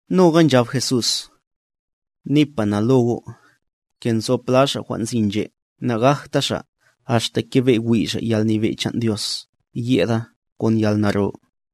Noga nchab Jesús: —Nipa na lo go', ke nzo pla xa' jwan' nzi nche' nagajta xa' axta kebe' wi' xa' yalnyebe' chan' Dios yeda kon yalnaro.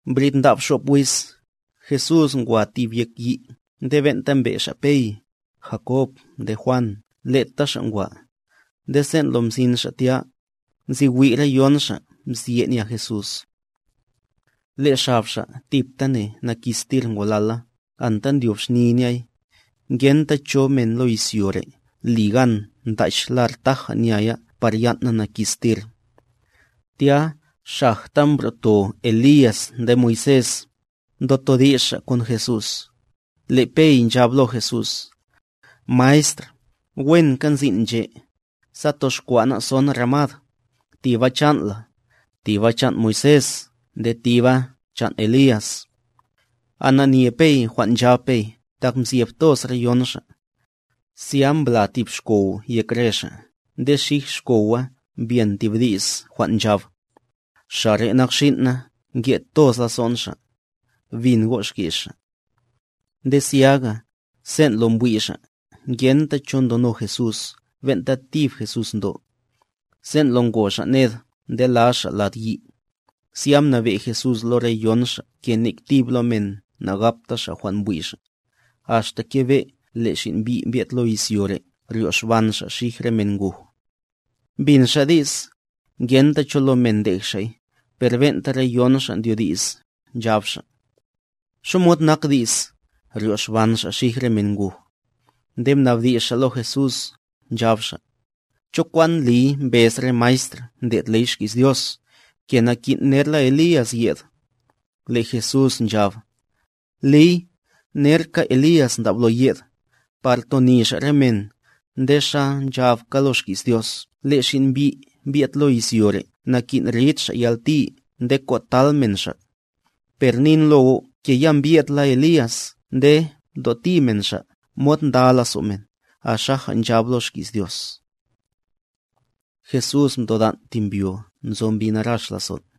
Mbrid ndab xop wiz, Jesús ngwa tib yek yi' nde ben'ta mbe' xa' Pey, Jakob nde Juan leta xa' ngwa; nde sen' lo mzin xa' tya, nzi wi' re yon xa' mzye' nya Jesús. Le' xab Xa' tiptane nakistir ngolala anta ndyob xni nyay, ngenta cho men lo izyo re' li gan ntach lar taja nya ya par yan' na nakistir. Tya xajta mbro'to Elías nde Moisés, ndotodi's xa' kon Jesús. Le' Pey nchab lo Jesús: —Maestr, wenka nzin' nche'; sa toxkwa' ná' son ramad, tiba chan' la, tiba chan' Moisés nde tiba chan' Elías. Ananye Pey jwan' nchab Pey tak mzyeb toz re yon xa'. Zya mbla tib xkow yek re xa' nde xij xkowa mbyen tib di's jwan' nchab: —Xa' re' nak xin' na nke' toz lazo'n Xa'. Bin go' xki's Xa'. Nde zyaga, sen' lo mbwi' xa', ngenta cho ndono Jesús ben'ta tib Jesús ndo. Sen' lo ngo xa' ned ndela xa' lad yi', zya mnabe' Jesús lo re yon xa' ke nek tib lo men nagapta xa' jwan' mbwi' xa', axta kebe' le' Xin' Mbi' mbye'd lo izyo re' ryoxban Xa' xij re men nguj. Mbin xa' di's, ngenta cho lo men ndej xa'y, per ben'ta re yon xa' ndyo di's, nchab xa': —Xamod nak di's, “ryoxban Xa' xij re men nguj”. Nde mnabdi's xa' lo Jesús, nchab xa': —¿Cho kwan ndliy mbez re maestr ndlo' ley xki's Dios, ke nakin' nerla Elías yed? Le' Jesús nchab: —Liy, nerka Elías ndablo yed, par toni xa' re men, nde xa nchabka lo xki's Dios le' Xin' Mbi' mbye'd lo izyo re' nakin' rid Xa' yalti nde kotal men Xa'. Per nin lo go' ke ya mbye'dla Elías nde mtoti men xa' mod nda lazo' men, axaja nchab lo xki's Dios. Jesús mtodan' tib mbyo nzo mbi narax lazon'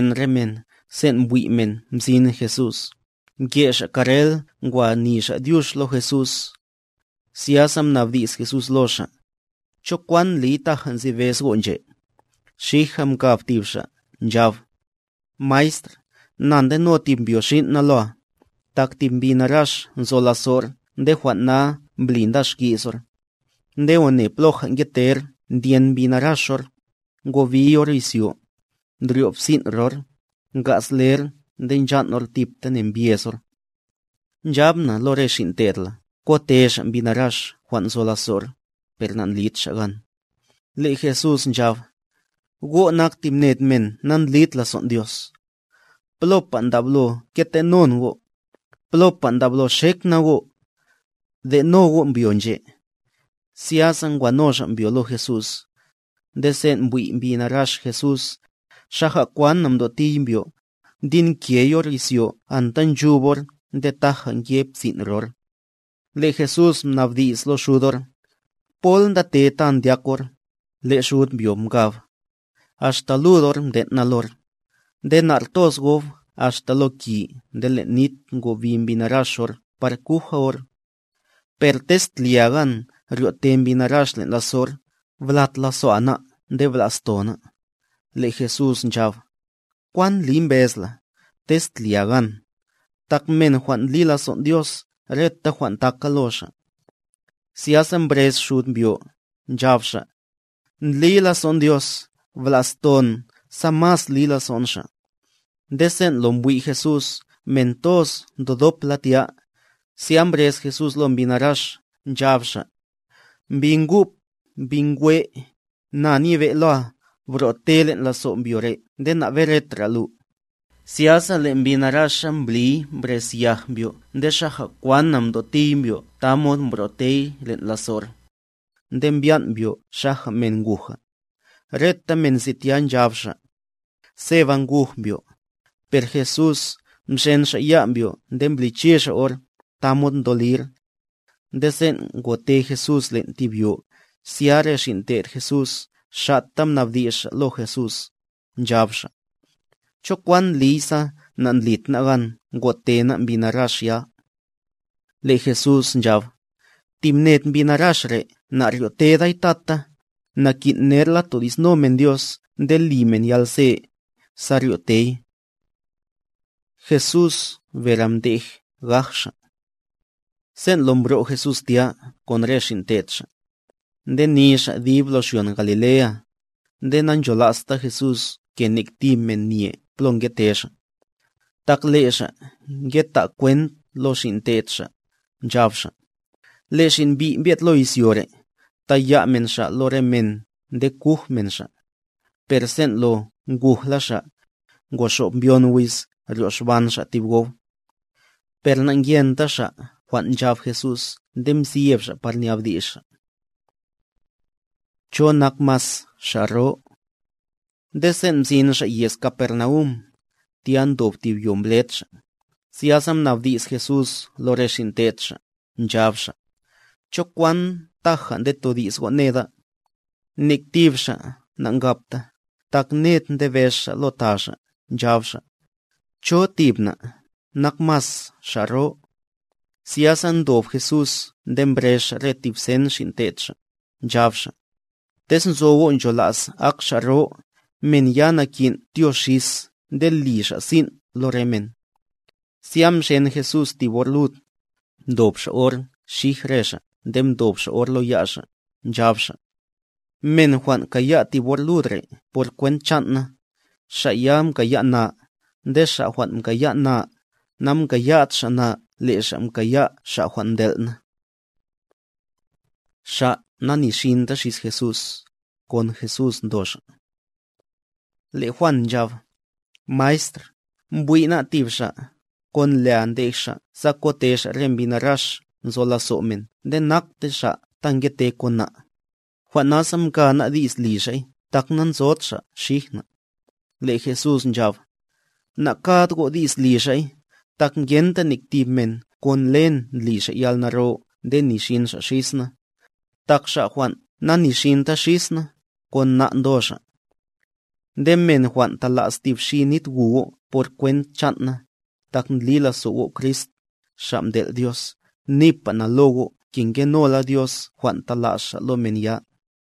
Nde axta nzoyen re men sen' mbwi' men mzin Jesús, mke xa' karrel ngwa ni xa' dyux lo Jesús. Zyasa mnabdi's Jesús lo xa': —¿Cho kwan ndliy taja nzi bez go' nche'? Xija mkab tib xa', nchab: —Maestr, na ndeno tib mbyo xin' na loa, tak tib mbi narax nzo lazo'r nde jwan' na mbli nda xki's or. Nde one ploja ngeter ndyen mbi narax or, ngobiy or izyo, ndryo' psin' ror, nga'z ler nde nchan' or tiptane mbyez or. Nchab na lo re xin' te'd la kote xa' mbi narax jwan' nzo lazo'r, per nandlid xa' gan. Le' Jesús nchab: —¡Go' nak tib ned men nandlid lazon' Dios! ¿Plopa ndablo kete'non go'? ¿Plopa ndablo xek na go'? De'no go' mbyo nche'. Zyasa ngwano xa' mbyo lo Jesús. Nde sen' mbwi' mbi narax Jesús, xaja kwana mtotiy mbyo, mdinkey or izyo anta nchub or nde taja nke psin' ror. Le' Jesús mnabdi's lo xud or: —¿Pol ndate ta ndyak or? Le' xud mbyo mkab: —Axta lud or mden' na lor. Nde na'r toz gob axta lo ki nde len' nit ngobi mbi narax or par kuja or. Per tez tlia gan ryo'te mbi narax len' lazo'r, blat lazo'a ná' nde bla'sto ná'. Le' Jesús nchab: —¿Kwan ndliy mbez la, “tez tlia gan”? Tak men jwan' ndli lazon' Dios reta jwan' taka lo xa'. Zyaga mbrez xud mbyo, nchab xa': —Ndli lazo'n Dios, bla'ston sa mas li lazo'n Xa'. Nde sen' lo mbwi' Jesús men toz ndodop la tya, zya mbrez Jesús lo mbi narax, nchab Xa': —Mbi ngup, mbi nkwe', na nyebe' loa, bro'te len' lazo' mbyo re' nde naberetra lu. Zyasa le' mbi naraxa mbliy mbrez yaj mbyo nde xaja kwana mtotiy mbyo tamod mbro'tey len' lazo'r; nde mbyan' mbyo xaja men nguja. Reta men nzi tya, nchab xa': —Seba nguj mbyo. Per Jesús, mxen Xa' ya' mbyo nde mbliche Xa' or, tamod mdolir. Nde sen' ngote Jesús len' tib yo, zya re xin' te'd Jesús xa'ta mnabdi's xa' lo Jesús, nchab xa': —¿Cho kwan ndliy sa nandlid ná' gan ngote ná' mbi narax ya? Le' Jesús nchab: —Tib ned mbi narax re' naryoteday tata, nakin' nerla todi'sno men Dios nde li men yalze, sa ryotey. Jesús bere mdej gaj Xa' Sen' lo mbro' Jesús tya kon re xin' te'd Xa', ndeni xa' dib lo xyon Galilea; nde nancholasta Jesús ke nek tib men nye plo ngete Xa'. Tak le' Xa' ngeta' kwent lo xin' te'd Xa', nchab Xa': —Le' Xin' Mbi' mbye'd lo izyo re', taya' men Xa' lo ya' re men nde kuj men Xa'. Per sen' lo ngujla Xa', ngoxob mbyon wiz ryoxban Xa' tib gob. Per na'ngyenta xa' jwan' nchab Jesús nde mzyeb xa' par nabdi's xa'. ¿Cho nak mas xa' ro? Nde sen' mzin xa' yez Capernaum; tya ndob tib yo mbled xa', zyasa mnabdi's Jesús lo re xin' te'd Xa', nchab Xa': —¿Cho kwan taja ndetodi's go' neda? Nek tib xa' nankabta, tak ned ndebez xa' lo ta xa', nchab xa': —¿Cho tib na', nak mas xa' ro? Zyasa mdob Jesús nde mbrez Xa' re tib sen xin' te'd Xa', nchab Xa': —Tez nzo go' nchola's ak xa' ro, men ya nakin' tyo xis nde li xa' sin' lo re men. Zya mxen Jesús tib or lud, mdo Xa' or xij re xa' nde mdob Xa' or lo ya' Xa', nchab Xa': —Men jwan' kaya' tib or lud re' por kwent chan' na, xa' ya mkaya' na; nde xa' jwan' mkaya' na, namkaya'd xa' na le' xa' mkaya' Xa' jwan' mtel' na. Xa' nanixinta xis Jesús, kon Jesús ndo xa' Le' Juan nchab: —Maestr, mbwi' ná' tib xa', kon lea ndej xa' sa ngote xa' re mbi narax nzo lazo' men nde nakte xa' ta ngete kon na', jwan' nasa mka ná' di's li xa'y tak nanzod xa' xij na'. Le' Jesús nchab: —Nakad go' di's li xa'y; tak ngenta nek tib men kon len ndli xa' yalnaro nde nixin xa' xis na. Tak xa' jwan' nanixinta xis na', kon na' ndo xa'. Nde men jwan' ta'las tib xi nit gu go' por kwent chan' na, tak ndli lazo' go' Crist, Xa' mtel' Dios,a nipa na lo go' ke ngenola Dios jwan' ta'las Xa' lo men ya.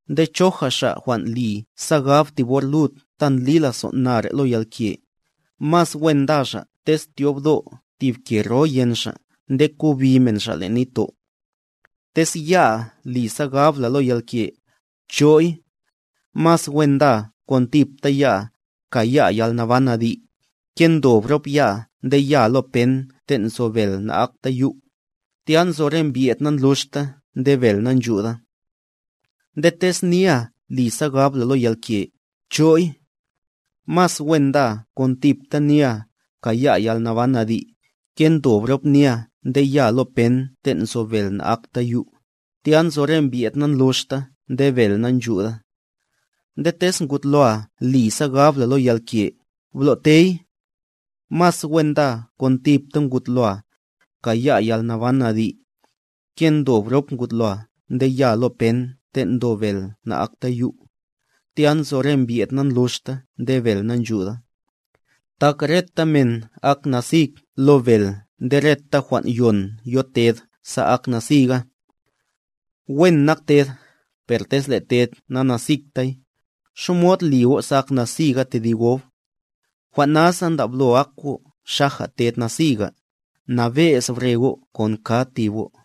’Nde choja xa' jwan' li sa gab tib or lud ta ndli lazon' na re' lo yalke, mas wen nda xa' tez tyobdo' tib ke ro yen xa' nde kobi men xa' len' nitto'. Tez ya'a li sa gab la lo yalke, bcho'y. Mas wen ndaa kon tipta ya'a, kaya'a yalnaban adi', ke ndob rop ya'a nde yaa lo pen ten' nzo bel na'akta yu', tya nzo re mbye'd nandluxta nde bel nanchuda. Nde tez nia li sa gab la lo yalke, bcho'y. Mas wen ndaa kon tipta nia, kaya'a yalnaban adi', ke ndob rop nia nde yaa lo pen ten' nzo bel na'akta yu', tya nzo re mbyed nandluxta nde bel nanchuda. Nde tez ngud loa li sa gab la lo yalke, blo'tey. Mas wen ndaa kon tipta ngud loa, kaya'a yalnaban adi', ke ndob rop ngud loa nde yaa lo pen ten' ndo bel na'akta yu', tya nzo re mbyed nandluxta nde bel nanchuda. ’Tak reta men ak nasig lo bel nde reta jwan' yon yo ted sa ak nasiga.b Wen nak ted, per tez le' ted nanasigtay,c ¿xamod li go' sa ak nasiga tedib gob? Jwan' nasa ndablo ak go' xaja ted nasiga, nabe'z bre go' kon kad tib go'.